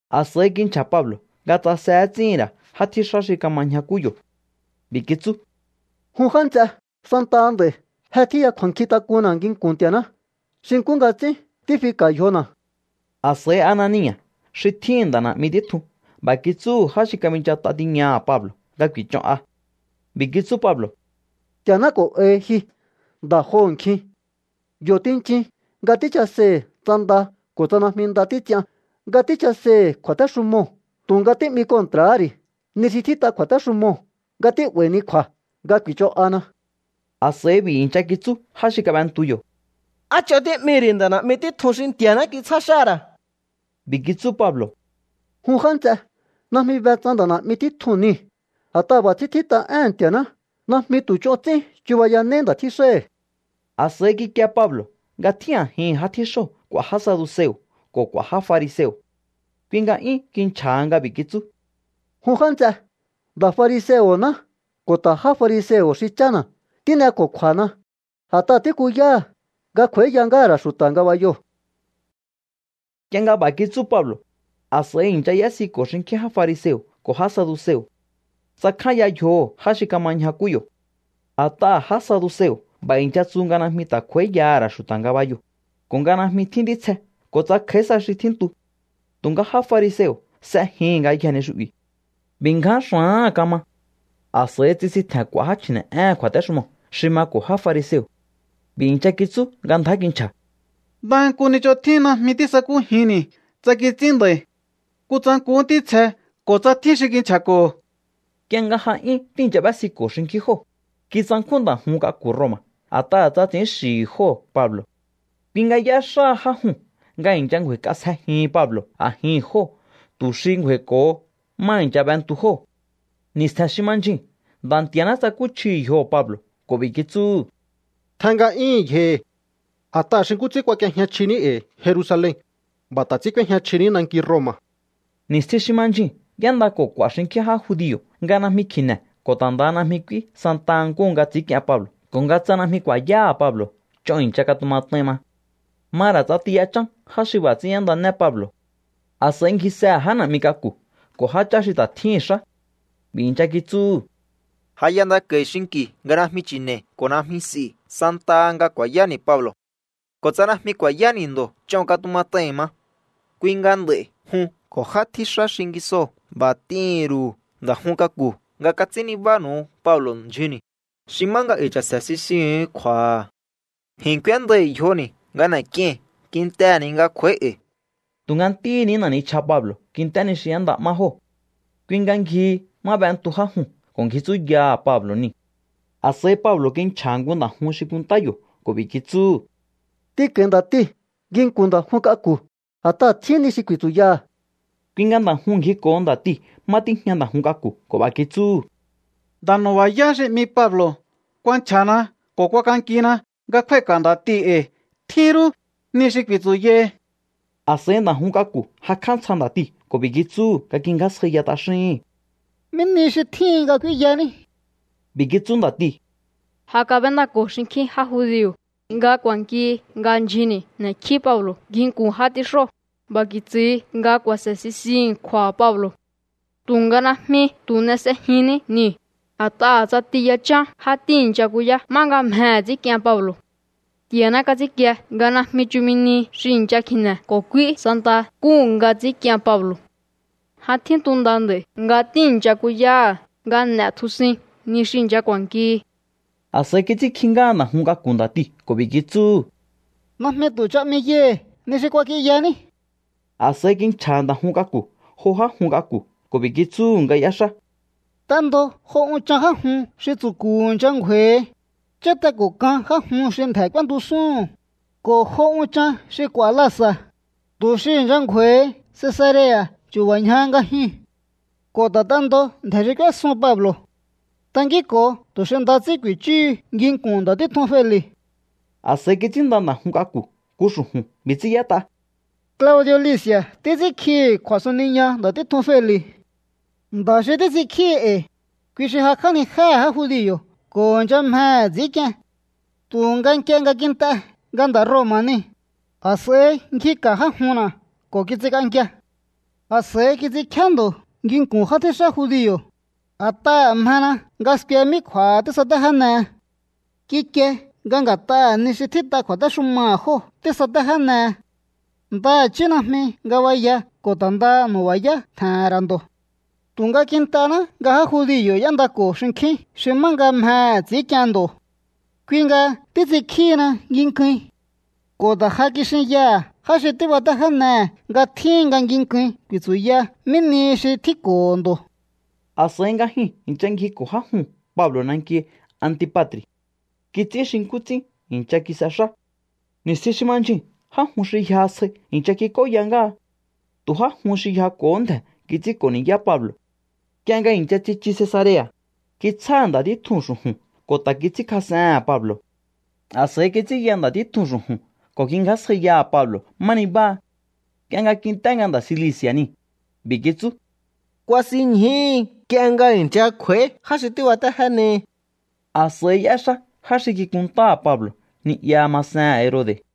A̱s'a̱i kinchja̱ Pablo̱ nga tsase ts'íhi̱n ra̱ já tjíxá xi kama ñjakú yo̱. B'i̱ kitsú: —Jun já nts'e, santaha nd'a̱i̱ je tjíya kju̱a̱nkjintak'unna̱ nginku̱n Nti̱a̱ná xi nkú nga ts'ín tífika̱ yjona̱. A̱s'a̱i Anania̱ xi tjíhi̱n nda̱ na̱'mi títjun b'a̱ kitsúhu̱ já xi kabinchat'a tiñaha̱ Pablo̱ nga ku̱i̱ch'on'a. B'i̱ kitsú Pablo̱: —Nti̱a̱ná k'o̱n'ahi ji, nda̱ joho̱nkjin. Yo̱ tinchin nga tíchaseihi̱ tsa nda ko̱ tsa najmi nda títs'ian nga tíchaseihi̱ kju̱a̱téxumoo̱, tu̱nga tí'mi kontra̱há ri̱ ni xi tjít'a kju̱a̱téxumoo̱ nga tí'ba̱i̱hini kju̱a̱ nga ku̱i̱ch'on'ana. A̱s'a̱i b'i̱ i̱ncha kitsú já xi kab'entu yo̱: —¿Á ch'on tí'mihi̱ ri̱ nda̱ na̱'mi títjun xi Nti̱a̱ná kitsjá xáha̱ ra̱? B'i̱ kitsú Pablo̱: —Jun já nts'e, najmi be tsa nda̱ na̱'mi títjun niu̱. A̱t'aha̱ b'a̱ ts'ín tjít'a éhe̱n Nti̱a̱ná: “Najmi tu̱ ch'on ts'ín chubayanéí nda̱ tjíxáhi̱.” A̱s'a̱i kikie Pablo̱ nga tjín a̱jihi̱n já tjíxóo̱ k'u̱a̱ já saduseo̱ ko̱ k'u̱a̱ já fariseo̱. Kui nga 'yún kinchja̱ha nga b'i̱ kitsú: —Jun já nts'e, nda̱ fariseo̱ná ko̱ ta̱ já fariseo̱ xi chána̱. Tín'eko̱kju̱a̱na a̱t'aha̱ tíkuyáha̱ nga kj'u̱a̱íya ngáha̱ ra̱ xu̱ta̱ ngabayoo̱. Nk'ie nga b'a̱ kitsú Pablo̱, a̱s'a̱i i̱ncha y'ésiko̱ xinkjín já fariseo̱ ko̱ já saduseo̱. Tsakjánya yjoho̱ já xi kama ñjakú yo̱. A̱t'aha̱ já saduseo̱ b'a̱ i̱ncha tsu nga najmi ta̱ kj'u̱a̱íyaha̱ ra̱ xu̱ta̱ ngabayoo̱, ko̱ nga najmi tjín ntítsje ko̱ tsa kj'a̱í sa xi ta̱ tjíntu. Tu̱nga já fariseo̱ s'ejihi̱n ngayjee̱ ni xu'bi̱. B'i̱ ngján xa̱áha̱n kama. A̱s'a̱i tsisintje̱n k'u̱a̱ já chji̱ne̱'éhe̱n kju̱a̱téxumoo̱ xi mako̱ já fariseo̱. B'i̱ i̱ncha kitsú nga ndjá kinchja̱: —Ndaha nku ni xi ch'on tjín najmi tísakújinni̱ tsa kits'ín nda̱i̱. Kutsa nkuhú ntítsje ko̱ tsa tjín xi kinchja̱ko̱ho̱. Nk'ie nga ja 'yún tíi̱ncha b'ésiko̱ xinkjín jóo̱, kitsankjún nda̱ jun k'aku̱ Roma̱ a̱t'aha̱ tsa ts'i̱ín xi̱hi̱ jóo̱ Pablo̱. Kui nga y'éxáha já juu̱n nga i̱ncha ngju̱a̱i̱k'asjejihin Pablo̱ a̱jihi̱n jóo̱ tu̱ xi ngju̱a̱i̱ko̱ho má i̱ncha b'entu jóo̱. Ni̱stje̱n xi ma ndyjuu̱n Nda̱ Nti̱a̱ná tsakúchjihi̱ yjoho̱ Pablo̱ ko̱ b'i̱ kitsúhu̱: —Tjen nga'yíhi̱n yjohi̱. A̱t'aha̱ xi nkú ts'ín kuak'iejña chjiní e̱i̱ Jerusalen, b'a̱ ta̱ ts'ín k'úéjña chjiní nanki Roma̱. Ni̱stjin xi ma ndyjuu̱n y'éndako̱ k'u̱a̱ xinkjín já judio̱ nga najmi kji̱ne̱ ko̱ ta̱ ndaha najmi k'úí santa nkúhu nga ts'i̱ínk'ien Pablo̱ ko̱ nga tsa najmi ku̱a̱yáha̱ Pablo̱ ch'on i̱ncha katumat'ain ma. Ma ra̱ ts'ati yachán já xi b'a̱ ts'ín y'éndané Pablo̱. A̱s'a̱i ngjisehe̱ já na̱'mi k'aku̱ ko̱ jáchá xi ta̱ tjíhi̱n xá. B'i̱ i̱ncha kitsúhu̱: —Ja y'endako̱i̱ xinki̱ nga najmi chi̱ne̱i̱ ko̱ najmi s'i̱ santaha nga ku̱a̱yáni̱ Pablo̱. Ko̱ tsa najmi ku̱a̱yáni̱ ndo̱ ch'on katumat'ai̱n ma. Kui nga nd'a̱i̱ jun ko̱ já tjíxá xingisoo̱ b'a̱ t'ihi̱n ru̱u nda̱ jun k'aku̱ nga kats'ín nibánu̱u Pablo̱ ndyjunni̱, xi má nga e̱i̱ cha̱se̱ sisihu̱un kju̱a̱ha̱. Ji̱n k'úéndai̱ yjoni̱ nga n'e̱k'iei̱n kintehe̱ ni nga kj'u̱a̱í e̱i̱. Tu̱nga ntíhi̱ ní na̱ nichja Pablo̱ kint'é ni xi y'énda'má jóo̱. Kui nga ngjihi má b'entu já juu̱n ko̱ ngji tsúyaha̱ Pablo̱ niu̱. A̱s'a̱i Pablo̱ kinchja̱ha̱ nku nda̱ jun xi kunntá yo̱ ko̱ b'i̱ kitsúhu̱: —T'inko̱i̱ nda̱tii̱ nginku̱n nda̱ jun k'aku̱, a̱t'aha̱ tjín ni xi ku̱i̱tsu̱yaha̱. Kui nga nda̱ juu̱n ngjiko̱ho nda̱tiu̱ má tíjña nda̱ jun k'aku̱ ko̱ b'a̱ kitsúhu̱: —Nda̱ nu̱ba̱yá xi 'mi Pablo̱ kuanchja̱na ko̱ kuakankina nga kjúái̱ka̱ nda̱tii̱ e̱i̱. Tjín rú ni xi ku̱i̱tsu̱yahi. A̱s'a̱i nda̱ jun k'aku̱ jakj'á ntsja nda̱tiu̱ ko̱ b'i̱ kitsúhu̱ nga ngjingjásjaiya t'axíhi̱n: —¿Mí ni xi tjíhin nga k'úínyaní? B'i̱ kitsú nda̱tiu̱: —Ja kab'éndako̱ xinkjín já judio̱ nga ku̱a̱nkihi nga ndyjunni̱ n'e̱kjí Pablo̱ nginku̱n já tjíxóo̱. B'a̱ ku̱i̱tsu̱hi nga ku̱a̱se̱ sisihi̱n kju̱a̱ha̱ Pablo̱. Tu̱nga najmi tu̱ n'e s'ejinní niu̱, a̱t'aha̱ ts'ati yachán já tíi̱ncha kuyá 'ma nga mjehe̱ ts'i̱ínk'ien Pablo̱. Nti̱a̱ná kats'ínkie nga najmi chumi nihi xi i̱ncha kji̱ne̱ ko̱ k'úí santa nkúhu nga ts'i̱ínk'ien Pablo̱. Ja tjíntu nda nd'a̱i̱ nga tíi̱ncha kuyáha̱ nga n'e̱tjusuin ni xi i̱ncha k'u̱a̱nkihi. A̱s'a̱i kits'ínkji ngáha nda̱ jun k'aku̱ nda̱tiu̱ ko̱ b'i̱ kitsúhu̱: —Najmi tu̱ ch'a 'miyaihi̱ ni xi kuak'inyaní. A̱s'a̱i kinchja̱ha̱ nda̱ jun k'aku̱ jo já jun k'aku̱ ko̱ b'i̱ kitsúhu̱ nga y'éxá: —T'endo jo unchan já jun xi tsu̱ku̱ i̱ncha ngju̱a̱i̱hi, cháte ko̱ kan já jun xi ndje̱ k'úéntusúhu̱n, ko̱ jo unchan xi k'u̱a̱ lasa̱, tu̱ xi i̱ncha ngju̱a̱i̱hi Cesarea̱ chu̱ba̱ ñja nga jyuu̱n. Ko̱ ta̱ t'endo ndje̱ xi k'úésun Pablo̱. Tankínko̱o tu̱ xi nda ts'ín ku̱i̱chúhu nginku̱n nda̱ títjun Feli̱. A̱s'a̱i kits'ínnda nda̱ jun k'aku̱ nku xu̱ju̱n. B'i̱ ts'ín y'ét'a: “Claudi̱o̱ Lisi̱a̱ títs'ínkjihi̱ kju̱a̱suniña nda̱ títjun Feli̱. Nda̱ xi títs'inkjíhi e̱i̱, kui xi jakj'ánijéhe̱ já judio̱ ko̱ i̱ncha mjehe̱ ts'i̱ínk'ien. Tu̱nga nk'ie nga kint'e nga nda̱ Roma̱ niu̱, a̱s'a̱i ngjika̱ já junna̱ ko̱ kits'ink'ankia. A̱s'a̱i kits'inkjíá ndo̱ nginku̱n já tjíxá judio̱, a̱t'aha̱ mjena nga skue mí kju̱a̱ha tísatéjénehe. Kikie nga nga̱t'aha̱ ni xi tjít'a kju̱a̱téxumaha̱ jóo̱ tísatéjénehe. Ndaha̱chí najmi ngabaya ko̱ ta̱ ndaha nu̱ba̱yá tje̱he̱n ra̱ ndo̱. Tu̱nga kint'ená nga já judio̱ y'éndako̱ xinkjín xi má nga mjehe̱ ts'i̱ínk'ien ndo̱. Kui nga títs'inkjíhina nginkuin. Ko̱ ta̱ ja kixinyaha̱ já xi tíbatéjénehe̱ nga tjíhin nga nginkuin ku̱i̱tsu̱ya mí nihi xi tjínko̱ho̱ ndo̱.” A̱s'a̱i nga jyuu̱n i̱ncha ngjiko̱ já juu̱n Pablo̱ nanki Antipa̱tri̱. Kits'ín xi nkú ts'ín i̱ncha kis'exá. Ni̱stjin xi ma ndyjuu̱n já jun xi yjaha sjai i̱ncha kik'óya ngáha. Tu̱ já jun xi yjako̱hó ndje̱ kits'ínko̱ ni̱yá Pablo̱. Nk'ie nga i̱ncha tsichu Cesarea̱, kitsjáha̱ nda̱ títjuu̱n xu̱ju̱n ko̱ ta̱ kits'ínkjas'ehe̱n Pablo̱. A̱s'a̱i kits'ínya nda̱ títjuu̱n xu̱ju̱n ko̱ kingjásjaiyaha̱ Pablo̱ má nibáha. Nk'ie nga kint'é nga nda̱ Cilici̱a̱ niu̱, b'i̱ kitsú: —Kuasinñjúhu nk'ie nga i̱ncha kj'u̱a̱í já xi tíbatéjénehi. A̱s'a̱i y'éxá já xi kikuntáha̱ Pablo̱ ni'ya masehe̱n Herode̱.